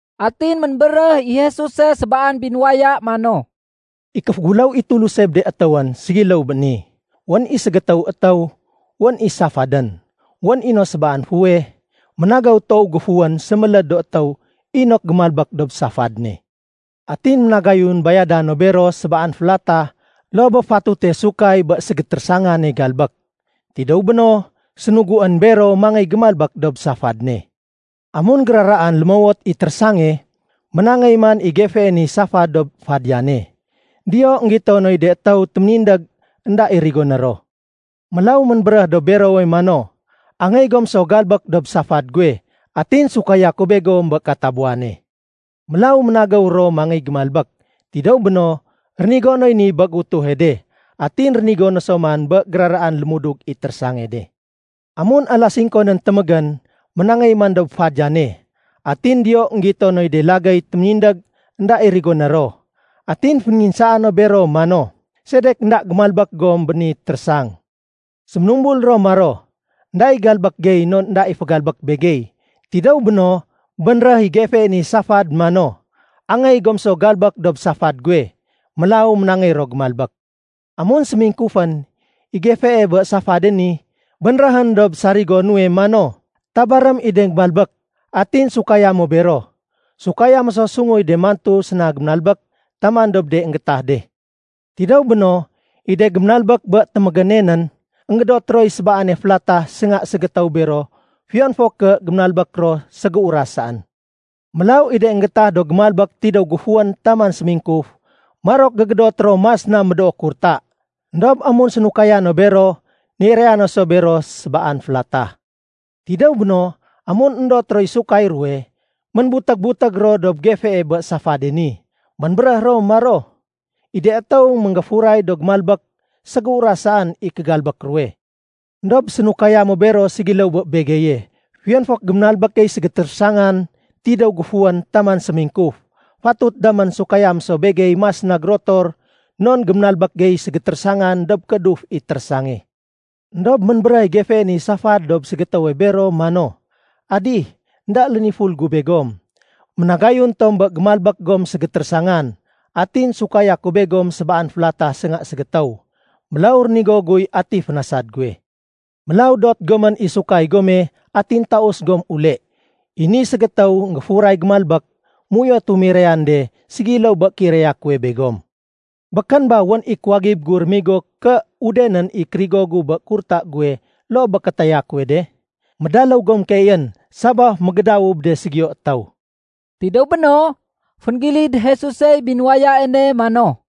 Atin ménbéréh i Jesuse sébaan binuwaya mano, “I kéféguléw i Tuluse bé de étéwén ségiléw bé ni. Wén i ségétéwe étéw, wén i safadén. Wén i no sébaan fuweh ménagéw toow géfuwén séméléd do étéw inok gémalbék dob safad ne. Atin ménagayun bayada no bero sébaan félatah loo bé fatute sahud bé ségétérésangane galbék. Tidéw béno, sénuguén bero mangéy gémalbék dob safad ne. Amun géraraan lémowot i térésange, ménangéy man i gefee ni safad dob fadiyane. Diyo, énggito noy de étéw téménindég énda i rigoné ro. Mélaw ménbéréh dob berowe mano, ‘Angéy gom so galbék dob safad guwe, atin bayada ku begom bé katabuwane.’ Mélaw ménagéw ro mangéy gémalbék. Tidéw béno, rénigo noy ni bé géutuhe de, atin rénigo no so man bé géraraan lémudug i térésange de. Amun alas singko nén témégénén, ménangéy man dob fadiyane. Atin diyo énggito noy de lagéy téménindég énda i rigoné ro. Atin fénénginsaa no bero mano, ‘Sedek énda gémalbék gom bé ni térésang?’ Séménumbul ro maro, ‘Enda i galbék gey non énda i fégalbék begey.’ Tidéw béno, bénréh i gefee ni safad mano, ‘Angéy gom so galbék dob safad guwe.’ Mélaw ménangéy ro gémalbék. Amun sémingkufén, i gefee bé safade ni bénréhén dob sarigo nuwe mano, ‘Tabarém i de géménalbék atin sukaya mo bero. Bayada mo sunguy de mantu séna gémalbék taman dob de énggétah de.’ Tidéw béno, i de géménalbék bé témégéne nén, énggédot roy sébaane félatah sénga ségétéw bero fiyon fo ké géménalbék ro ségéuras saén. Mélaw i de énggétah do géménalbék tidéw géfuwén taman sémingkuf, marok gégédot ro mas na médoo kurta. Endob amun bénayada no bero, niraya no so bero sébaan félatah. Tidéw béno, amun éndot roy sahud ruwe, ménbutég-butég ro dob gefee bé safade ni. Ménbéréh ro maro, ‘I de étéw énggéfuray do géménalbék, ségéuras saén i kégalbék ruwe. Endob sénahudo mo bero ségiléw so bé begeye fiyon fo ké géménalbék gey ségétérésangan tidéw géfuwén taman sémingkuf. Fatut damén bayada mo begey mas gérotor non géménalbék gey ségétérésangan dob kééduf i térésange.’ Endob ménbéréh i gefee ni safad dob ségétéwe bero mano, ‘Adih, énda léniful gu begom. Ménagayun tom bé gémalbék gom ségétérésangan atin bayada ku begom sébaan félatah sénga ségétéw. Mélaw rénigo guy ati fénasad guwe. Mélaw dot gomén i sahud gome atin taus gom ule. I ni ségétéw énggéfuray gémalbék, méuyotu mirayan de ségiléw bé kéiraya kuwe begom. Békén ba wén i kuwagib gu rémigo ké udenén i kérigo gu bé kurta guwe loo bé kétaya kuwe de? Médaléw gom keeyén sabaf mégédawu bé de ségiyo étéw.’” Tidéw béno, fénggilid Jesusey binuwaya ne mano,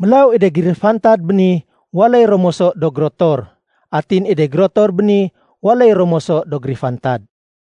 “Mélaw i de gérifantad béni, waléy ro moso do gérotor. Atin i de gérotor béni, waléy ro moso do gérifantad.”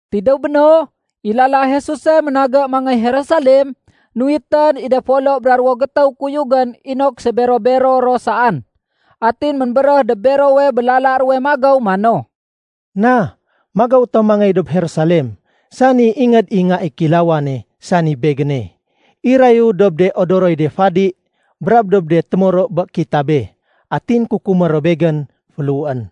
Tidéw béno, i lala Jesuse ménagé mangéy Jerusalem, nuwitén i de folo bra ruwo gétéw kuyugén inok sébero-bero ro saén. Atin ménbéréh dob berowe bé lala ruwe magéw mano, “Na, magéw tom mangéy dob Jerusalem, sani Ingéd i Nga i Kílawane, sani Begéne, irayu dob de odoroy do fadi brab dob de témoro bé kitabé. Atin kukumé ro Begén féléhuén.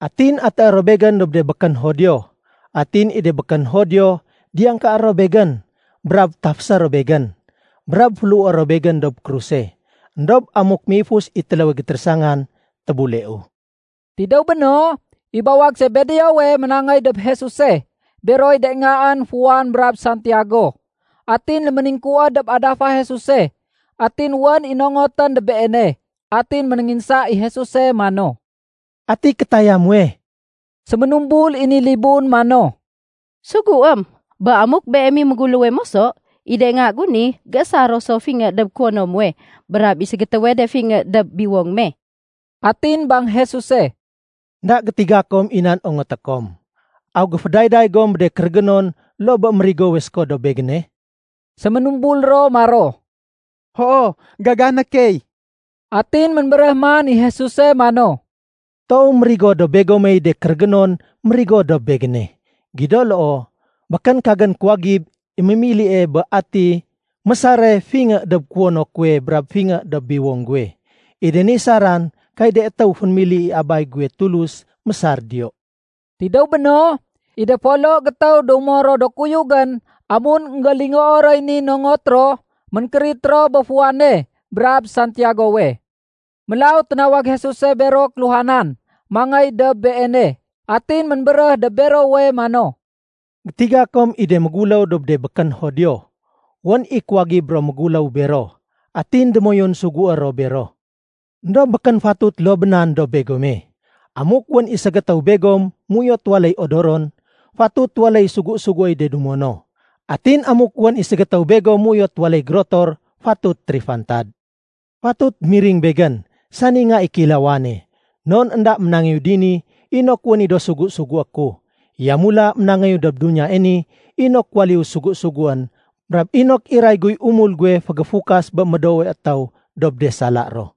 Atin atéé ro Begén dob de békén Judio. Atin i de békén Judio, diyangkaé ro Begén, brab tafésé ro Begén, brab féléhué ro Begén dob kruse. Endob amuk méifus i téléwe gétérésangan, tébuleu.” Tidéw béno, i bawag Sebedeowe ménangéy dob Jesuse beroy de ngaén Juan brab Santiago. Atin léméningkuwéd dob adafa Jesuse atin wén i nongotén dob Beene. Atin ménénginsa i Jesuse mano, “Ati kétaya muwe?” Séménumbul i ni libun mano, “Suguém bé amuk Beem i méguléwe moso, i de nga gu ni géésar ro so fingé dob kuwono muwe brab i ségétéwe de fingé dob biwong me.” Atin bang Jesuse, “Enda gétiga kom i nan ongoté kom. Aw géfédayday gom bé de kérégénon loo bé mérigowe séko dob Begéne?” Séménumbul ro maro, “Hoo, gagané key.” Atin ménbéréh man i Jesuse mano, “Toow mérigo dob begomey de kérégénon mérigowe dob Begéne. Gido loo, békén kagén kuwagib i mémilie bé ati mésare fingé dob kuwono kuwe brab fingé dob biwong guwe. I de ni saran kay de étéw fénémili i Abay guwe Tulus mésar diyo.” Tidéw béno, i de folo gétéw dumo ro do kuyugén amun énggélingoo roy ni nongot ro, ménkérit ro bé Juane brab Santiagowe. Mélaw ténawag Jesuse bero kéluhanan mangéy dob Beene, atin ménbéréh dob berowe mano, “Gétiga kom i de méguléw dob de békén Judio, wén i kuwagib ro méguléw bero, atin démoyun sugué ro bero. Endob békén fatut loo bé nan dob begome. Amuk wén i ségétéw begom méuyot waléy odoron, fatut waléy sugu-suguéy de dumo no. Atin amuk wén i ségétéw begom méuyot waléy gérotor, fatut térifantad. Fatut miring Begén, sani Nga i Kéilawane, non énda ménangéyu dini inok wén i do sugu-sugué ku. Yamula ménangéyu dob duniyae ni inok waléyu sugu-suguén brab inok iray guy umul guwe fégéfukas bé médoowe étéw dob de sala ro.”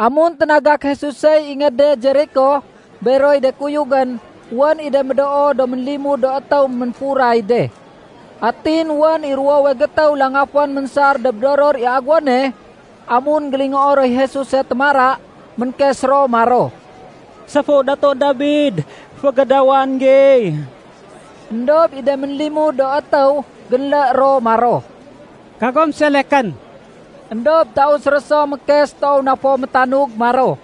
Amun ténagak Jesusey ingéde Jeriko beroy de kuyugén, wén i de médoo do ménlimud do étéw ménfuray de. Atin wén i ruwowe gétéw langafén ménsar dob doror i aguwone. Amun énggélingoo roy Jesuse témara, ménkes ro maro, “Séfu Datu Dabid, fégédawan gey!” Endob i de ménlimud do étéw génlé ro maro, “Kagom selekén!” Endob taus ro so mékes toow na fo métanug maro,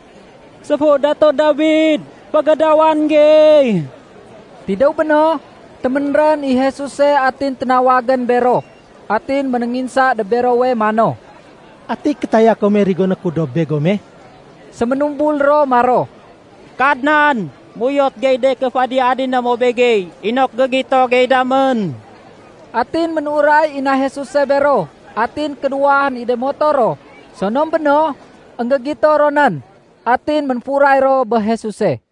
“Séfu Datu Dabid, fégédawan gey!” Tidéw béno, téménrén i Jesuse atin ténawagén bero. Atin ménénginsa dob berowe mano, “Ati kétaya kome rigoné ku dob begome?” Séménumbul ro maro, “Kadnan, méuyot gey de ké féadi-adiné mo begey inok gégito gey damén.” Atin ménuray i na Jesuse bero atin kénuwahén i de moto ro. Sonom béno, énggégito ro nén. Atin ménfuray ro bé Jesuse.